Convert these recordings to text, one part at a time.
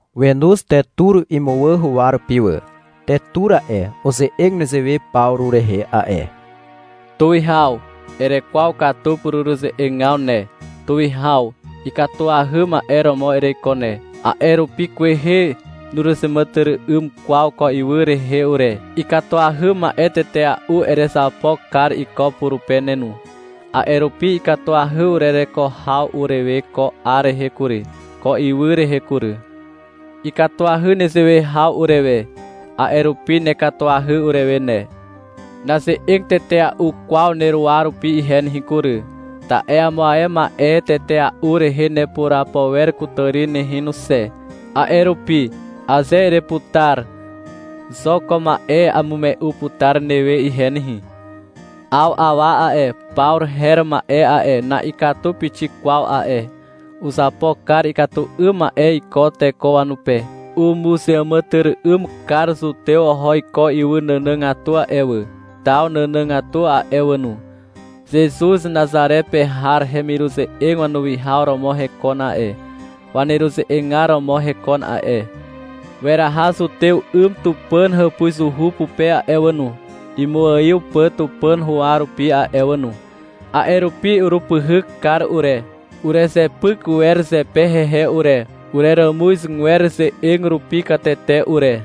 Wenoz Tetur imuwà huwa rupi wà. Tetur a'e, uze'eg nezewe Pawru rehe a'e. — Tuwihaw. Erekwaw katu pureruze'egaw ne. Tuwihaw ikatuahy ma'e romo ereiko ne, a'e rupi kwehe nuruzeàmàtyry'ym kwaw ko ywy rehe ure. Ikatuahy ma'e tetea'u erezapo kar iko purupe ne no. A'e rupi ikatuahy urereko haw urewe ko 'ar rehe kury, ko ywy rehe kury. Ikatuahy nezewe haw urewe. A'e rupi nekatuahy urewe ne. Naze'eg tetea'u kwaw neruwa rupi ihe nehe kury, ta'e amo ae ma'e tetea'u rehe nepurapo wer kutàri nehe no xe. A'e rupi, aze ereputar, xo ko ma'e amume'u putar newe ihe nehe. 'Aw awa a'e, Pawru her ma'e a'e, na'ikatu pixik kwaw a'e. Uzapo kar ikatu 'ym ma'e iko teko wanupe. Umuzeàmàtyry'ym kar zutew oho iko ywy nànàgatu a'e wà, taw nànàgatu a'e wà no. Zezuz Nazare pe har hemiruze'eg wanuwihaw romo hekon a'e, waneruze'egar romo hekon a'e. Weraha zutew 'ym Tupàn hàpuzuhu pupe a'e wà no, imuaiw pà Tupàn huwa rupi a'e wà no. A'e rupi urupyhyk kar ure. Urezepyk wer zepe hehe ure, ureràmuzgwer ze'eg rupi katete ure.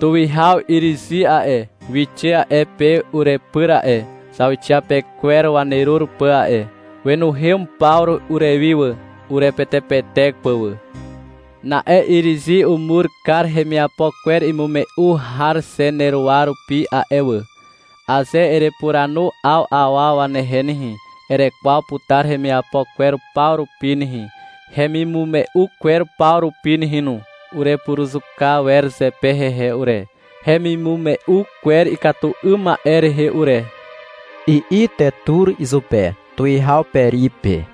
Tuwihaw Irizi a'e, wixe a'e pe urepyr a'e, zauxiapekwer wanerur pà a'e. Wenuhem Pawru urewi wà, urepetepetek pà wà. Na'e Irizi umur kar hemiapo kwer imume'u har xe neruwa rupi a'e wà. Aze erepuranu 'aw awa wanehe nehe, erekwaw putar hemiapo kwer paw rupi nehe, hemimume'u kwer paw rupi nehe no. Urepuruzuka wer zepe hehe ure, hemimume'u kwer ikatu 'ym ma'e rehe ure, i'i Tetur izupe, tuwihaw Peri pe.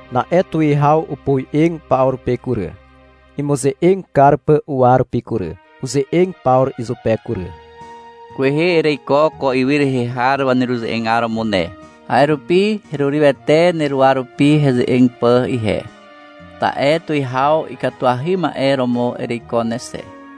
Na'e tuwihaw opoe'eg Pawru pe kury, imuze'eg kar pà uwa rupi kury. Uze'eg Pawru izupe kury. — Kwehe ereiko ko ywy rehe har waneruze'egar romo ne. A'e rupi herurywete neruwa rupi heze'eg pà ihe. Ta'e tuwihaw ikatuahy ma'e romo ereiko ne xe.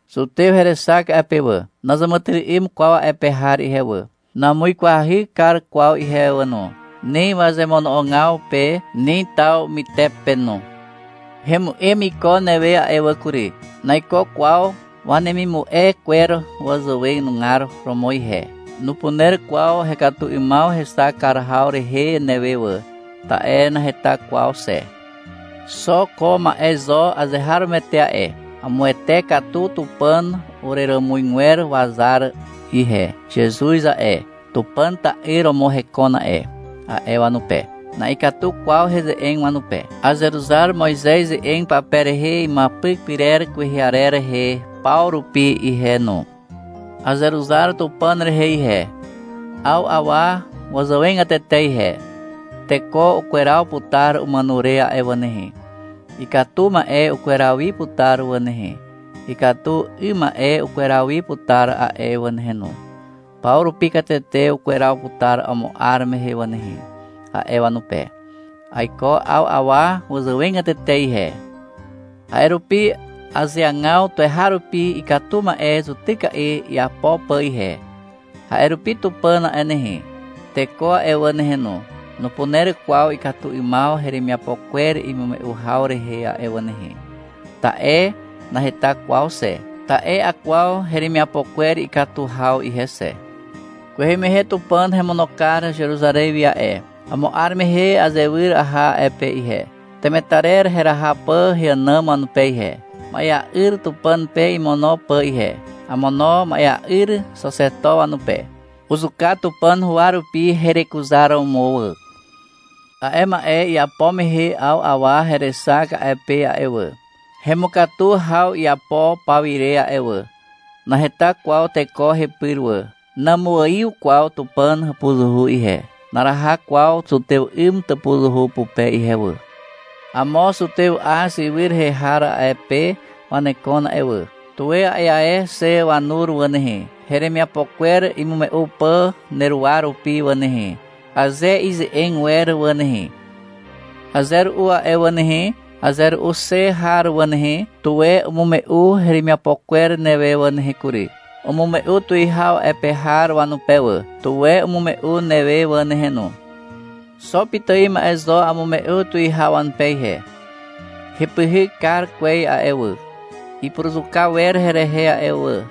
Zutew herexak a'e pe wà. Nazàmàtyry'ym kwaw a'e pe har ihe wà. Namuikwahy kar kwaw ihe wà no, ni wazemono'ogaw pe, ni taw mytepe no. Hemu'em iko newe a'e wà kury. Naiko kwaw wanemimume'u kwer zàwenugar romo ihe. Nupuner kwaw hekatu 'ymaw hexak kar haw rehe newe wà, ta'e naheta kwaw xe. Xo ko ma'e zo azeharomoete a'e. Amuwete katu Tupàn ureràmuzgwer wazar ihe. — Zezuz a'e, Tupàn ta'yr romo hekon a'e, a'e wanupe. Na'ikatu kwaw heze'eg wanupe. Azeruzar Moizez ze'eg pape rehe imuapyk pyrer kwehe arer rehe paw rupi ihe no. Azeruzar Tupàn rehe ihe, 'aw awa wazàwegatete ihe. Teko ukweraw putar umàno re a'e wà nehe. Ikatu ma'e ukweraw wi putar wà nehe, ikatu 'ym ma'e ukweraw wi putar a'e wà nehe no. Paw rupi katete ukweraw putar amo 'ar mehe wà nehe, a'e wanupe. Aiko 'aw awa wazàwegatete ihe. A'e rupi azeagaw tuweharupi ikatu ma'e zutyka'i iapo pà ihe. A'e rupi Tupàn a'e nehe, teko a'e wà nehe no, nupuner kwaw ikatu 'ymaw heremiapo kwer imume'u haw rehe a'e wà nehe, ta'e naheta kwaw xe. Ta'e akwaw heremiapo kwer ikatu haw ihe xe. Kwehe mehe Tupàn hemono kar Zeruzarez wi a'e. Amo 'ar mehe azewyr aha a'e pe ihe, temetarer heraha pà heànàm wanupe ihe, ma'ea'yr Tupàn pe imono pà ihe. Amono ma'ea'yr Xaxeto wanupe. Uzuka Tupàn huwa rupi herekuzaromo wà. A'e ma'e iapo mehe 'aw awa herexak a'e pe a'e wà, hemukatu haw iapo pawire a'e wà. Naheta kwaw teko hepyr wà. Namuaiw kwaw Tupàn hàpuzuhu ihe. Naraha kwaw zutew 'ym tàpuzuhu pupe ihe wà. Amo zutew Az ywy rehe har a'e pe wanekon a'e wà. Tuwe a'e ae xe wanur wà nehe, heremiapo kwer imume'u pà neruwa rupi wà nehe, aze ize'eg wer wà nehe. Aze ru'u a'e wà nehe, aze ru'u xe har wà nehe, tuwe umume'u heremiapo kwer newe wà nehe kury. Umume'u tuwihaw a'e pe har wanupe wà. Tuwe umume'u newe wà nehe no. Xo pitài ma'e zo amume'u tuwihaw wanupe ihe. — Hepyhyk kar kwez a'e wà, ipuruzuka wer herehe a'e wà,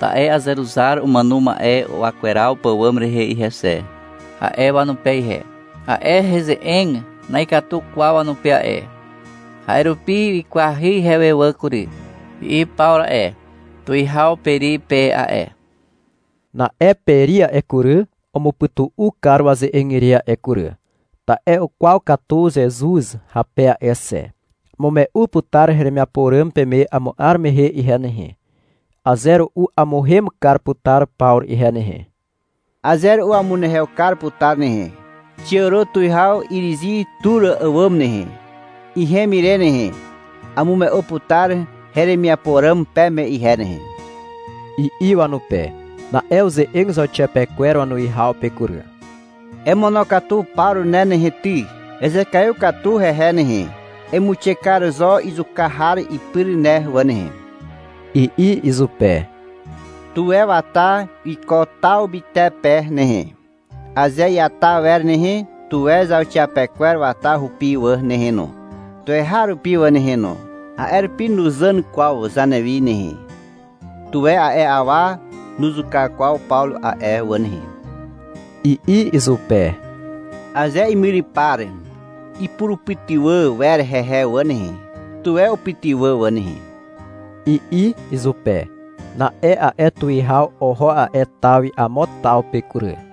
ta'e azeruzar umàno ma'e wakweraw pàwàm rehe ihe xe, a'e wanupe ihe. A'e heze'eg na'ikatu kwaw wanupe a'e. A'e rupi wikwahy ihewe wà kury, i'i Pawru a'e, tuwihaw Peri pe a'e. Na'e Peri a'e kury, umupytu'u kar waze'eg ire a'e kury, ta'e ukwaw katu Zezuz hape a'e xe. — Amume'u putar heremiapo ràm peme amo 'ar mehe ihe nehe. Aze ru'u amuhem kar putar Pawru ihe nehe. Aze ru'u amunehew kar putar nehe. Xiàro tuwihaw Irizi tur àwàm nehe. Ihem ire nehe, amume'u putar heremiapo ràm peme ihe nehe, i'i wanupe. Na'e uze'eg zauxiapekwer wanuwihaw pe kury. — Emonokatu Pawru ne nehe ty. Ezekaiw katu hehe nehe. Emuixe kar zo izuka har ipyr ne wà nehe, i'i izupe. — Tuwe wata iko taw mytepe nehe, aze iata wer nehe. Tuwe zauxiapekwer wata hupi wà nehe no, tuweharupi wà nehe no. A'e rupi nuzàn kwaw zanewi nehe. Tuwe a'e awa nuzuka kwaw Pawru a'e wà nehe, i'i izupe. — Aze imyrypar ipurupytywà wer hehe wà nehe, tuwe upytywà wà nehe, i'i izupe. Na'e a'e tuwihaw oho a'e taw wi amo taw pe kury.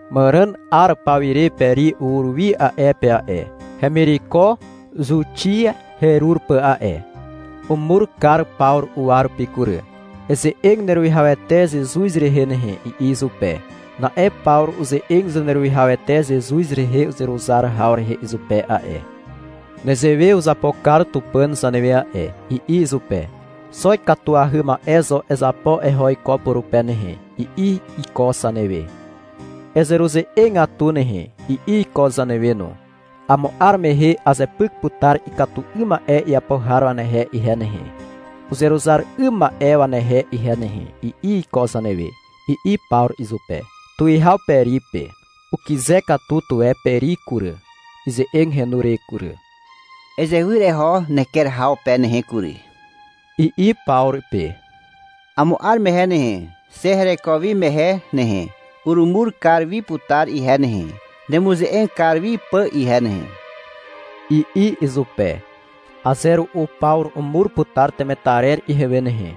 Màràn 'ar pawire Peri ur wi a'e pe a'e, hemireko Zuxia herur pà a'e. Umur kar Pawru uwa rupi kury. — Eze'eg neruwihawete Zezuz rehe nehe, i'i izupe. Na'e Pawru uze'eg Zaneruwihawete Zezuz rehe uzeruzar haw rehe izupe a'e. — Nezewe uzapo kar Tupàn zanewe a'e, i'i izupe. — Xo ikatuahy ma'e zo ezapo eho iko purupe nehe, i'i iko zanewe. — Ezeruze'egatu nehe, i'i iko zanewe no. — Amo 'ar mehe azepyk putar ikatu 'ym ma'e iapo har wanehe ihe nehe, uzeruzar 'ym ma'e wanehe ihe nehe, i'i iko zanewe, i'i Pawru izupe, tuwihaw Peri pe. Ukyze katu tuwe Peri kury, ize'eg henu re kury. — Ezewyr eho neker haw pe nehe kury, i'i Pawru pe. — Amo 'ar mehe nehe, xe hereko wi mehe nehe, urumur kar wi putar ihe nehe, nemuze'eg kar wi pà ihe nehe, i'i izupe. — Aze ru'u Pawru umur putar temetarer ihewe nehe,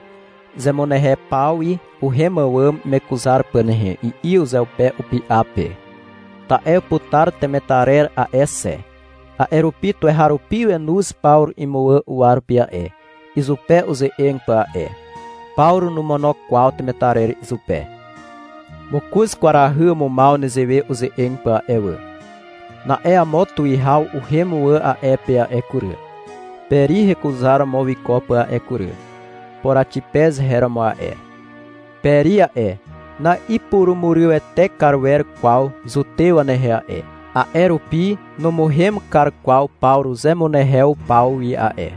zemunehew paw wi uhem àwàm imekuzar pà nehe, i'i uzeupe upy'a pe, ta'e uputar temetarer a'e xe. A'e rupi tuweharupi wenoz Pawru imuwà uwa rupi a'e, izupe uze'eg pà a'e. Pawru nomono kwaw temetarer izupe. Mokoz kwarahy umumaw nezewe uze'eg pà a'e wà. Na'e amo tuwihaw uhem wà a'e pe a'e kury, Peri hekuzaromo wiko pà a'e kury. Poraxipez her romo a'e. Peri a'e, na'ipurumurywete kar wer kwaw zutew wanehe a'e, a'e rupi numuhem kar kwaw Pawru zemunehew paw wi a'e.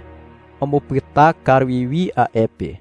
Umupyta kar wi wi a'e pe.